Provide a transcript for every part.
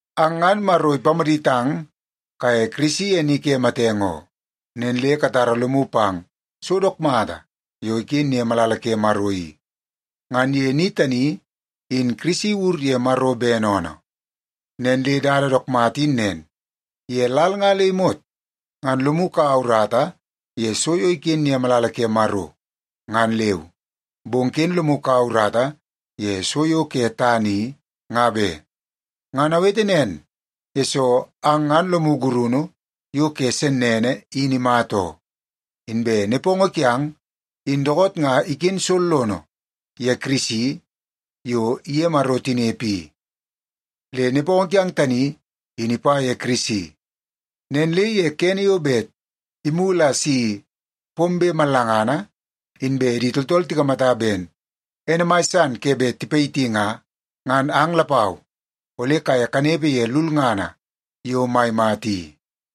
Ang ngan Maro ipamaditang kaye Kirisi ye ni ke matenge oo. Nen le katara lomu pang so dook mata yo iken ye malala ke Maro i. Ngan ye ni tani, in Kirisi iwur ye Maro bene oonoo. Nen le dada dook mata in nen, ye lal nga le imot ngan lomu kaua urata ye so yo iken ye malala ke Maro, ngan leu. Bong ken lomu kaua urata ye so yo ke tana i, nga be. Ngan awete nen, yesoo ang ngan lomu gurunu yo ke sennene in imata oo. Inbe nepongo kiang in dookoot nga iken sollono ye Kirisi yo iye Maro tinepe i. Le nepongo kiang tani, in ipa ye Kirisi. Nen le ye kene yo bet imulu a si pombe mallangana inbe di tooltool tikamata ben ene mai san ke bet tipayiti nga, ngan ang lapau ole kaye kanepe ye lulngana yo mai mata i.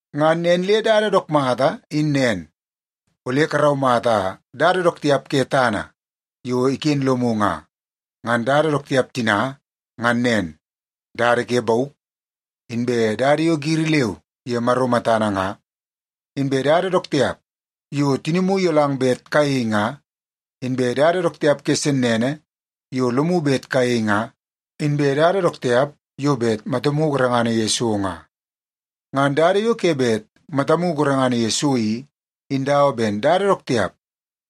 Ngan nen le dada dook mata in nen, ole karaumata dada dook tiap ke tana yo iken lomu nga. Ngan dada dook tiap tina ngan nen; dada ke bauk, inbe dada yo giri leu ye Maro matana nga, inbe dada dook tiap yo tinimu iyolang bet kayei nga, inbe dada dook tiap ke sennene yo lomu bet kayei nga, inbe dada dook tiap yo bet matamu gorengana ye so nga. Ngan dada yo ke bet matamu gorengana ye so i, in dawa ben dada dook tiap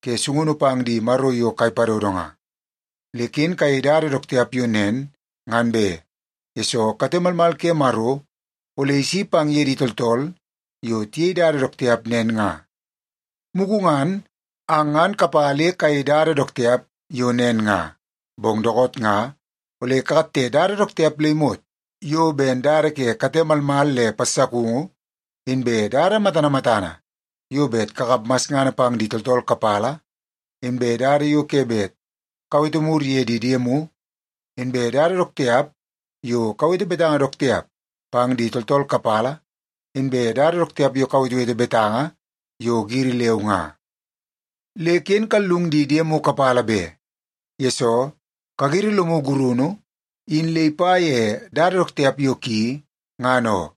ke sungunu pang di maro yo kai padodo nga. Le ken kayei dada dook tiap yo nen ngan be, yesoo kate malmal ke Maro ole isi pang ye di tooltool yo tiyei dada dook tiap nen nga. Mugu ngan, ang ngan kapa le kayei dada dook tiap yo nen nga. Bong dookoot nga ole kakatte dada dook tiap le imot yo ben dada ke kate malmal le passakungu, inbe dada matana matana yo bet kakap masngana pang di tooltool kapala, inbe dada yo ke bet kawete mur ye di diemu, inbe dada dook tiap yo kawete betanga dook tiap pang di tooltool kapala, inbe dada dook tiap yo kawetewete betanga yo giri leu nga. Le ken kallung di diemu kapala be, yesoo kagiri lomu gurunu in le ipa ye dada dook tiap yo ki, ngan oo.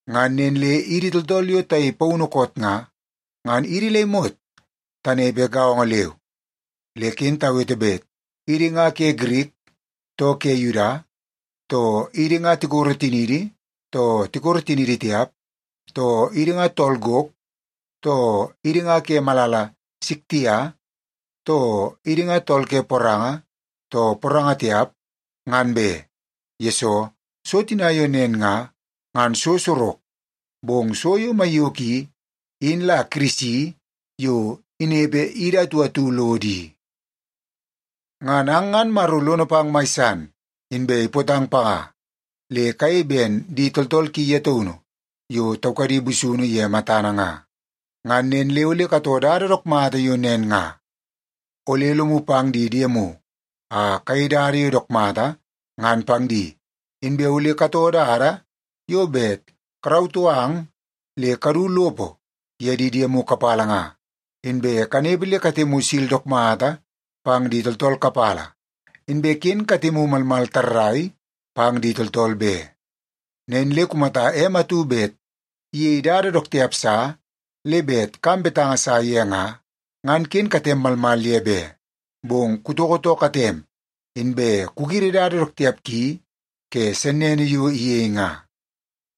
Ngan nen le idi tooltool yo tayei paunu koot nga, ngan idi le imot tanepe gaongo leu. Le ken tawete bet idi nga ke Girik too ke Yuda, too idi nga tikoro tiniidi too tikoro tiniidi tiap, too idi nga tool gok, too idi nga ke malala Siktia, too idi nga tool ke poranga too poranga tipa, ngan be, yesoo so tina yo nen nga, ngan so sorok. Bong so yo maiyoko i, in la Kirisi yo inepe idi atu atu lodo i. Ngan ang ngan Maro lono pang mai san, inbe ipootang panga, le kayei ben di tooltool ki ye taunu yo taukadi busunu ye matana nga. Ngan nen le ole katoo dada dook mata yo nen nga. Ole lomu pang di diemu a kayei dada yo dook mata ngan pang di, inbe ole katoo dada yo bet karautoo ang le kadu lopo ye di diemu kapala nga, inbe kanepe le katemu sil dook mata pang di tooltool kapala, inbe ken katemu malmal tarrai pang di tooltool be. Nen le kumata em atu bet iyei dada dook tiap sa le bet kam betanga sa ye nga, ngan ken katem malmal ye be, bong kutoko too katem, inbe kugiri dada dook tiap ki ke sennene yo iyei nga.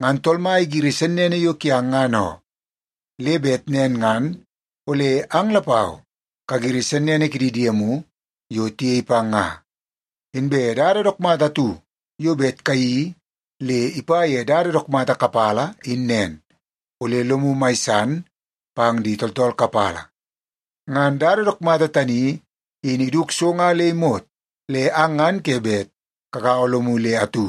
Ngan Tool Mai igiri sennene yo kiang ngan oo, le bet nen ngan ole ang lapau kagiri sennene kidi diemu yo tiyei pang nga. Inbe dada dook mata atu yo bet kayeii le ipa ye dada dook mata kapala in nen, ole lomu mai san pang di tooltool kapala. Ngan dada dook mata tani in iduk so nga le imot le ang ngan ke bet kagaua lomu le atu.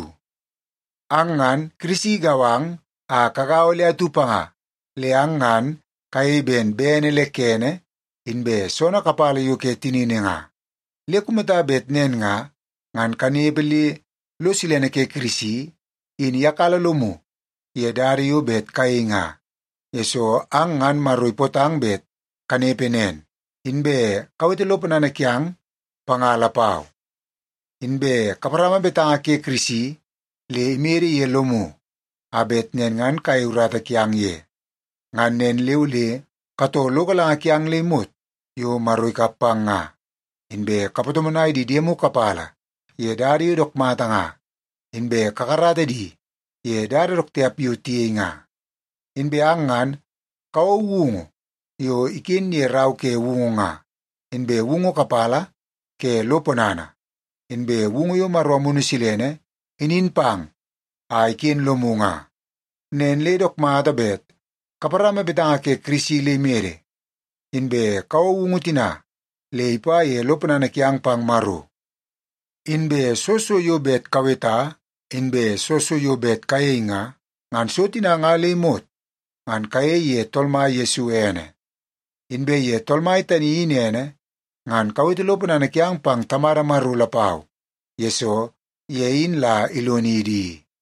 Ang ngan, Kirisi igau ang a kagaua le atu panga, le ang ngan kayei ben bene le kene inbe soonoo kapala yo ke tinini nga. Le kumata bet nen nga, ngan kanepe le lo silene ke Kirisi in iyakala lomu ye dada yo bet kayei nga, yesoo ang ngan Maro ipootang bet kanepe nen. Inbe kawete lo ponana kiang panga lapau. Inbe kaparama betanga ke Kirisi le imede ye lomu, a bet nen ngan kayei urata kiang ye. Ngan nen le ole katoo lo galanga kiang le imot yo Maro ikap pang nga, inbe kapatomonai di diemu kapala ye dada yo dook mata nga, inbe kakarata di ye dada dook tiap yo tiyei nga. Inbe ang ngan kawou woungu yo iken ye Rau ke Woungu nga, inbe woungu kapala ke lo ponana, inbe woungu yo Maro Amunu Silene inin pang a iken lomu nga. Nen le dook mata bet kaparama betanga ke Kirisi le imede, inbe kawou woungu tina le ipa ye lo ponana kiang pang Maro. Inbe soo so yo bet kaweta inbe soo so yo bet kayei nga, ngan so tina nga le imot ngan kayei ye Tool Mai Yesu ene. Inbe ye Tool Mai tani in ene, ngan kawete lo ponana kiang pang Tamada Maro lapau, yesoo ye in la ilonidi i.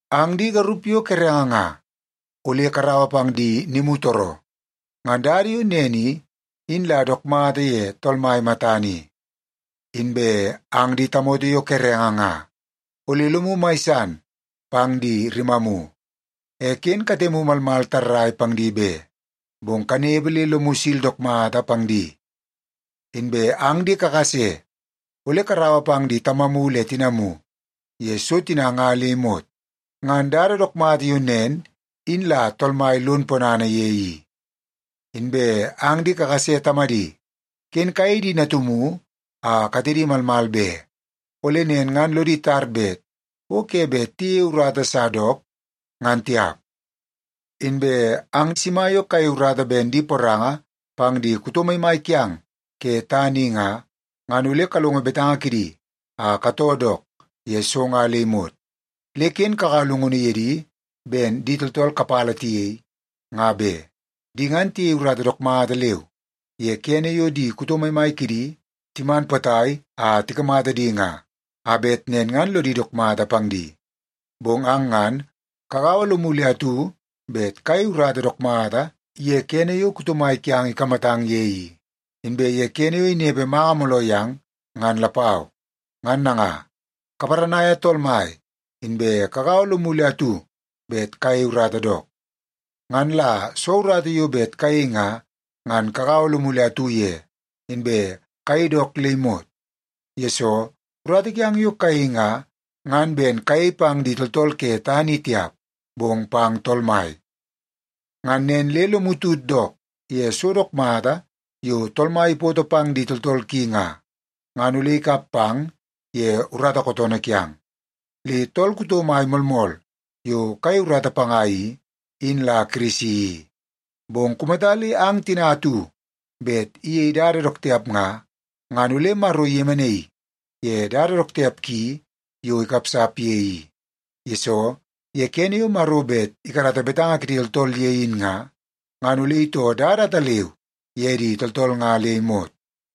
Ang di garup yo kerenge nga, ole karaua pang di nimutooroo. Ngan dada yo nen i, in la dook mata ye Tool Mai matana i. Inbe ang di tamoto yo kerenge nga, ole lomu mai san pang di rimamu. E ken katemu malmal tarrai pang di be, bong kanepe le lomu sil dook mata pang di. Inbe ang di kakase, ole karaua pang di tamamu le di tinamu ye so tina nga le imot. Ngan dada dook mata yo nen in la Tool Mai lon ponana ye i. Inbe ang di kakase tamadi, ken kayei di natumu a katedi malmal be. Ole nen ngan lodi tar bet o ke bet tiyeie urata sa dook, ngan tiap. Inbe ang sima yo kayei urata ben di poranga pang di kuto maimai kiang ke tana i nga, ngan ole kalongo betanga kidi a katoo dook ye so nga le imot. Le ken kakaua llungunu ye di ben di tooltool kapala tiyei, nga be. Di ngan tiyei urata dook mata leu ye kene yo di kuto maimai kidi timan potai a tikamata di nga, a bet nen ngan lodi dook mata pang di. Bong ang ngan kagaua lomu le atu bet kayei urata dook mata ye kene yo kuto mai kiang ikamatang ye i, inbe ye kene yo inepe manga mooloo yang, ngan lapau. Ngan nanga, kaparanaia Tool Mai, inbe kagaua lomu le atu bet kayei urata dook. Ngan la soo urata yo bet kayei nga, ngan kagaua lomu le atu ye, inbe kayei dook le imot. Yesoo, urata kiang yo kayei nga, ngan ben kayei pang di tooltool ke tana i tiap, bong pang Tool Mai. Ngan nen le lomu tut dook ye so dook mata yo Tool Mai ipoto pang di tooltool ki nga, ngan ole ikap pang ye urata kootoonoo kiang. Le tool kuto mai moolmool yo kayei urata panga i, in la Kirisi i. Bong kumata le ang tina atu bet iyei dada dook tiap nga, ngan ole Maro iyemenaii ye dada dook tiap ki yo ikapsap ye i. Yesoo, ye kene yo Maro bet ikarata betanga kidi tooltool ye in nga, ngan ole itoo dada ataleu ye di tooltool nga le imot.